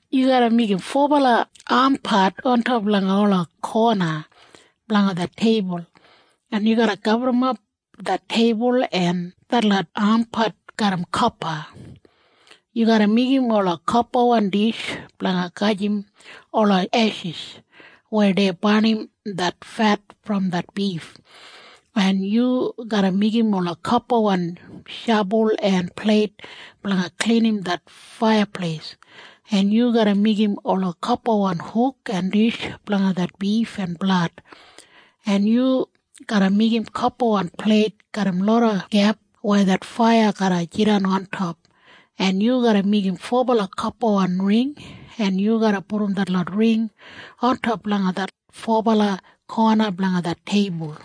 Yu garra meigim fobala ampat ontop langa ola kona blanga det teibul, en yu garra gaburrumap det teibul en detlot ampat garram kopa. Yu garra meigim ola kopawan dish blanga gajim ola eshis weya dei barnim det fet brom det bif, en yu garra meigim ola kopawan shabul en pleit blanga klinim det faiyapleis, en yu garra meigim ola kopawan huk en dish blanga det bif en blad, en yu garra meigim kopawan pleit garram loda gep weya det faiya garra jidan ontop, en yu garra meigim fobala kopawan ring, en yu garra pudum detlot ring ontop langa det fobala kona blanga det teibul.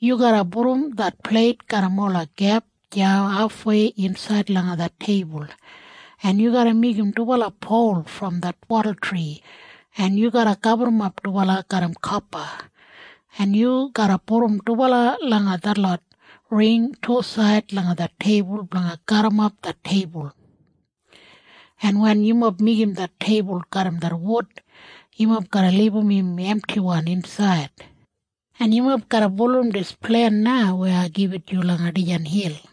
Yu garra pudum det pleit garram ola gep deya hafwei insaid langa det teibul, en yu garra meigim dubala pol brom det wadultri, en yu garra gaburrumap dubala garram kopa, en yu garra pudum dubala langa detlot ring tusaid langa det teibul blanga garrimap det teibul. En wen yumob meigim det teibul garram det wud, yumob garra libum im emtiwan insaid, en yumob garra bulurrum dis plen na weya ai gibit yu langa dijan hil.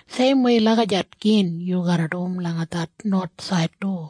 Seimwei lagijat gin yu garra dum langa det nowathsaid du.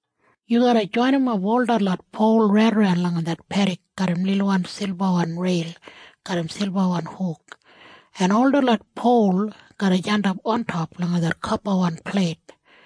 Yu garra joinimap ol detlot pol raidaran langa det pedik garram lilwan silbawan reil garram silbawan huk, en ol detlot pol garra jandap ontop langa kopawan pleit.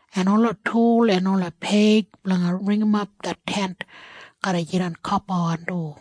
en ola tul en ola peig blanga ringimap det Tent garra jidan kopawan du.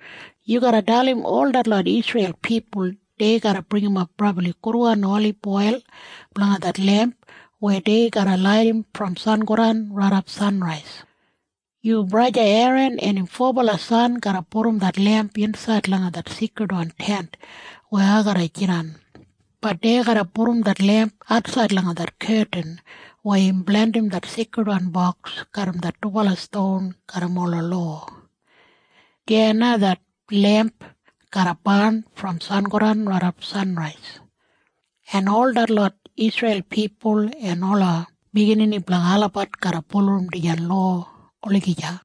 “Yu garra dalim ol detlot Isreil pipul dei garra bringimap brabli gudwan oliboil blanga det lemp weya dei garra laidim brom sangodan raidap sanrais. Yu braja Eran en im fobala san garra pudum det lemp insaid langa det Seikridwan Tent weya ai garra jidan. Bat dei garra pudum det lemp atsaid langa det ketin weya im blandim det Seikridwan Boks garram det dubala ston garram ola lowa. Deya na det lemp garra barn brom sangodan raidap sanrais. En ol detlot Isreil pipul en ola biginini blanga olabat garra bulurrum dijan lowa olagija.”